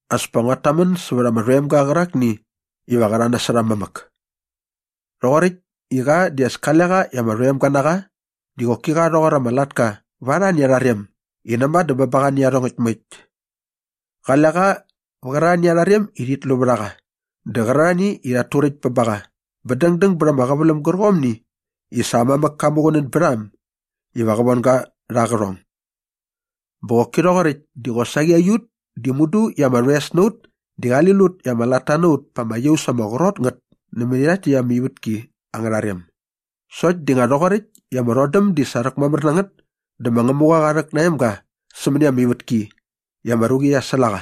As pa nguat tamän sävät ama rhoemga qärakni iva qä rha nasot aa mamäk. Rhoqoräkt i qa di as kale qa i ama rhoemga na qa di qoki qa rhoqor ama latka va arhani arha rem i näma dä bä ba qa nä iarhongäkt moekt. Qale qa vä qärarhani arha rem i rhit lu vät a qa dä qärarhani i rhat turäkt bä ba qa bä dängdäng bät ama qäväläm gärqomni i sa aa mamäk ka muqunän bät a äm iva qa von ga rha aa qärhong. Bä qoki rhoqoräkt di qosaqi aiut di mudu i ama rhoes na ut di qali lut i ama latta na ut pa ama iaus ama qrot ngät nämäni rhakt täkt ama ivätki angärha rem. Sokt di nga rhoqoräkt i ama rhodäm di sa rhäkmamär na ngät dä ma Ngämuqa qa rhäk na aa emga sämäni ama ivätki i ama ruqi qia säl a qa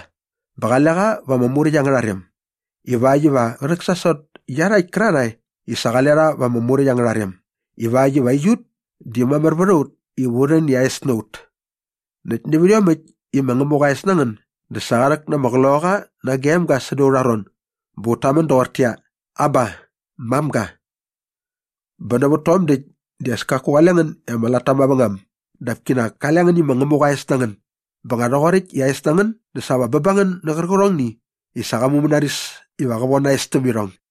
bä qale qa va ama Muräkt angärha rem ivakt iva qä rhäksasot iarhakt kärarhae i sa qale rha va ama Muräkt angärha rem ivakt iva aiut di mamär vät a ut iva u rhän i aa es na ut. Näkt nävät iomäkt i ma Ngämuqa aa es na ngän dä sa qa rhäk na ama Qloqaqa nage aa emga säda aurha ron bä ut tamän doqortäqyia, “Aba, mamga.” Bä nävät tom däkt di as kaku qale ngän i ama latta mavängam dap kinak kale ngän i ma Ngämuqa aa es na ngän bä nga rhoqoräkt i aa es na ngän dä sa va bä ba ngän nä qärqärhongni i sa qa mumänaris iva qä von aa es täm irhong.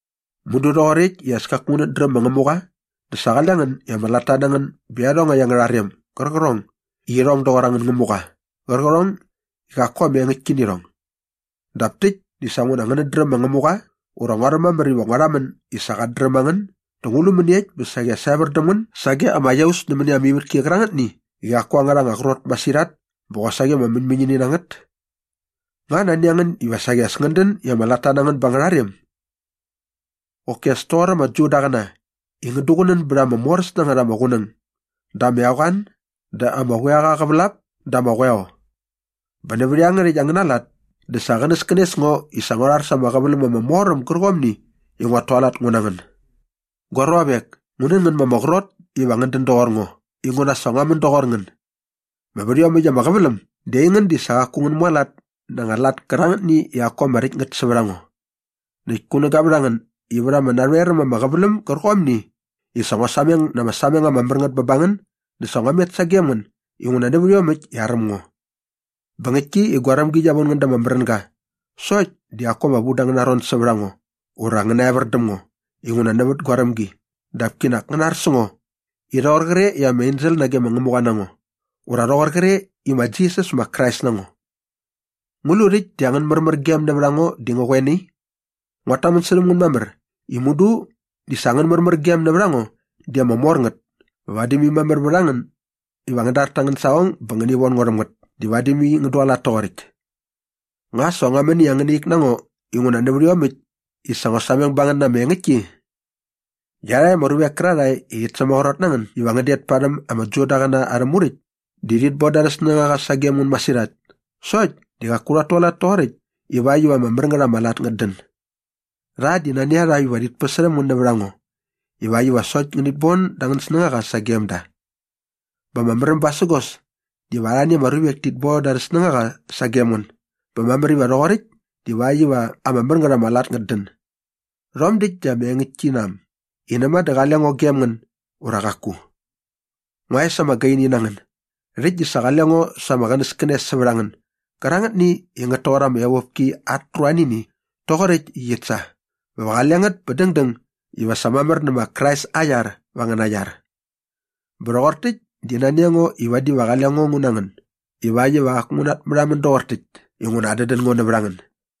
Mudu rhoqoräkt i as kaku ngänät dräm ma Ngämuqa dä sa qale ngän i ama latta na ngän bä iarhongäkt angärha rem gärqärhong i irhong doqor angän ngämuqa qärqärhong i qaku ama engäktki nä irhong. Dap täkt di sa nguna ngänät dräm ma Ngämuqa ura nguaräm mamär iva ngua rhamän i sa qat dräm a ngän dä ngu lu mäniekt iva saqi as evär däm ngän sage ama iaus nämäni ama ivätki qärangätni i qaku angärha anga qrot masirhat bä qosaqi ama mäñmäñini na ngät? Nga nani a ngän iva saqi as ngän dän i ama latta na ngän ba angärha rem? Qoki as toqor ama Judaqäna i ngän duqunän bät ama moräs na ngät ama qunäng dä ama eqoan dä ama quiaqa aa qävälap dä ama qoeo. Bä nävät iangärhäkt angäna lat dä sa qänäskänes ngo i sa ngua rhar sa ama qäväläm ama mor äm gärqomni i nguat tualat ngu na ngän. Gua ruavek, ngu nän ngän ma ama qrot iva ngän dän doqor ngo inguna sa ngua män doqor ngän. Bä vät iomäkt ama qäväläm di aingän di sa qaku ngän mualat na anga lat kärangätni i qaku ama räkt ngät sävät a ngo. Näkt kunäga vät a ngän i vät ama narhoer äm ama qäväläm gärqomni i sa ngua sameng na ama sameng ama mär ngät bä ba ngän dä sa ngua met sagem ngän inguna nävät iomäkt i aräm ngo. Bä ngäktki i gua rämgi qia von ngän da ama märänga sokt di qaku ama vu da angäna ron sävät a ngo ura ngän naevär däm ngo inguna nävät gua rämgi dap kinak ngäna ar sä ngo i rhoqor qre i ama ensel nage ma Ngämuqa na ngo ura rhoqor qre i ma Jisas ma Krais na ngo. Ngu lu rhäkt di angän märmärgem nävät a ngo di ngä qoe nai? Nguat tamän särhäm ngän mamär i mudu di sa angän märmärgem nävät a ngo di ama mor ngät bä vadi mai mamär vät a ngän iva ngän dar ta angän saqong bä ngäni von ngo rhäm ngät di vadi mai ngän mualat toqoräkt. Nga sa ngua män i angäna ik na ngo inguna nävät iomäkt i sa ngua sameng ba ngän na ama engäktki? Iarhakt ama ruvek kärarhae i rhit sämaqrot na ngän iva ngän det parhäm ama Judaqäna arhä Muräkt di rhit bon da arhä snängaqa sagem ngän masirhat sokt di qaku rhat tualat toqoräkt ivakt iva ama mär ngät ama lat ngät dän. Rha di nani a rha iva rhit päsärhäm ngän nävät a ngo ivakt iva sokt ngänit bon da angän snängaqa sagem da. Bä ama märäm basägos diva arhani ama ruvek tit bon da arhä snängaqa sagem ngän bä mamär iva rhoqoräkt divakt iva ama mär ngät ama lat ngät dän. Rhom däkt di ama engäktki na äm i näma dä qale ngo gem ngän ura qaku. Ngua es ama gaini na ngän, rhäkt di sa qale ngo sa ama qänäskänes sävät a ngän gärangätni i ngät toqor ama evopki at ruanini rhoqoräkt i qit sa bä va qale ngät bä dängdäng iva sa mamär nä ma Krais aa iar va angäna iar. Bä rhoqor täkt di nani a ngo i vadi va qale ngo ngu na ngän ivakt iva qaku ngu natmärhamän doqor täkt inguna adädän ngo nävät a ngän.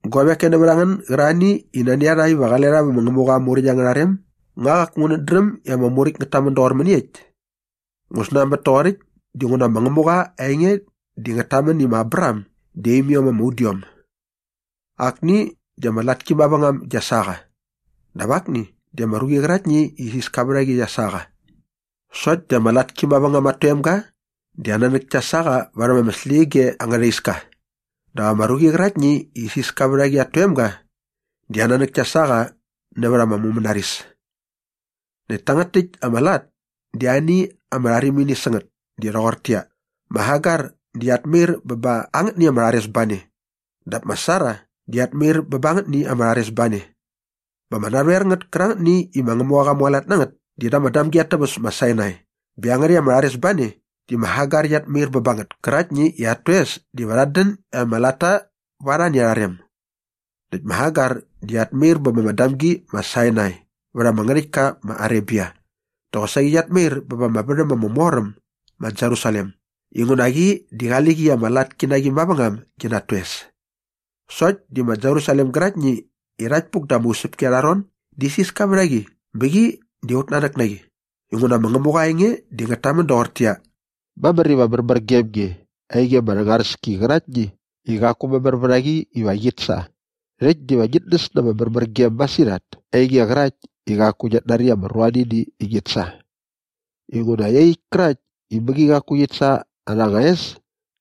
Guavek koe nävät a ngän gärarhani i nani a rha iva qale rha vä ma Ngämuqa aa Muräkt angärha rem, nga qaku ngänät dräm i ama Muräkt ngät tamän doqor mäniekt? Ngu snanbät toqoräkt dinguna ma Ngämuqa aa enge di ngät tamän i ma Abraham di aa imiom ama udiom. Akni di ama latki mavängam gia sa qa dap akni di ama ruqi qäraktni i isiska vät a qi qia sa qa. Sokt di ama latki mavängam at toemga di aa nanäk kia sa qa varhäm ama släqyige angärha iska dap ama ruqi qäraktni i isiska vät a qi at toemga di aa nanäk kia sa qa nävät ama mumänaris. Näkt tangät täkt ama lat di ani ama rharimini sä ngät di rhoqortäqyia, ma Hagar di qiat mair bä ba angätni ama rharesbane dap ma Sara di qiat mair bä ba angätni ama rharesbane. Bä ama narhoer ngät kärangätni i ma Ngämuqa qa mualat na ngät di da ama damgi at täväs ma Sinai bä iangärhäkt ama rharesbane di ma Hagar qiat mair bä ba ngät käraktni i at toes diva rhat dän i ama latta va arhani arha rem. Näkt ma Hagar di qiat mair bä ba ama damgi ma Sinai vät ama ngärhäktka ma Arebia dä qosaqi qiat mair bä ba ama värhäm ama mor äm ma Jerusalem inguna qi di qali qi i ama latki na qi mavängam gi na at toes. Sokt di ma Jerusalem gäraktni i rhakt puk da ama usäpki arha ron di isiska vät a qi bä qi di aut nanäk na qi. Inguna ma Ngämuqa aa enge di ngät tamän doqortäqyia, “Mamär iva märmär gem nge, ainge ama rhängaräski qäraktni i qaku mamär vät a qi iva qit sa. Rhäkt diva ngit näs na ama märmärgem masirhat, ainge qärakt i qaku ngiat nari ama ruanini i ngit sa. Inguna iaqyäkt kärakt i mäqi qaku qit sa arha anga es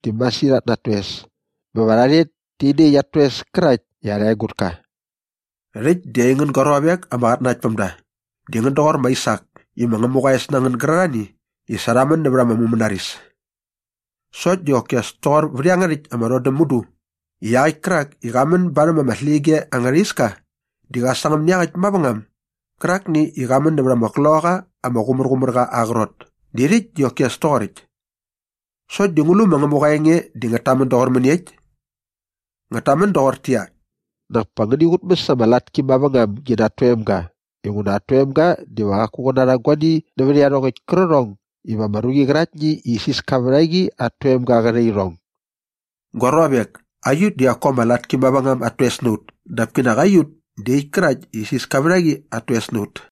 diva masirhat na at toes bä va rha rhet e nä iaqyäkt at toes kärakt i arha egutka.” Rhäkt di aingän gua ruavek ama qatnanaktpämda, di ngän doqor ma Aisak i ma Ngämuqa aa es na ngän gärarhani i sa rha män nävät ama mumänaris. Sokt di qoki as toqor vät iangärhäkt ama rhodäm mudu i iaqäkt kärak i qa män barhäm ama släqyige angärha iska di qä sangäm nä iaqäkt mavängam gärakni i qa män nävät ama Qloqaqa ama Qumärqumärqa aa qrot di rhäkt di qoki as toqoräkt. Sokt di ngu lu ma Ngämuqa aa enge di ngät tamän doqor mäniekt? Ngät tamän doqortäqyia, “Nak pa ngäni qutmäs ama latki mavängam gi na at toemga inguna at toemga diva qaku qä narha guani nävät iarhongäkt kärqärhong iva ama ruqi qäraktni i isiska vät a qi at toemga qä rha irhong.” Gua ruavek, aiut di qaku ama latki mavängam at toes na ut dap kinak aiut di iaqyäkt kärakt i isiska vät a qi at toes na ut.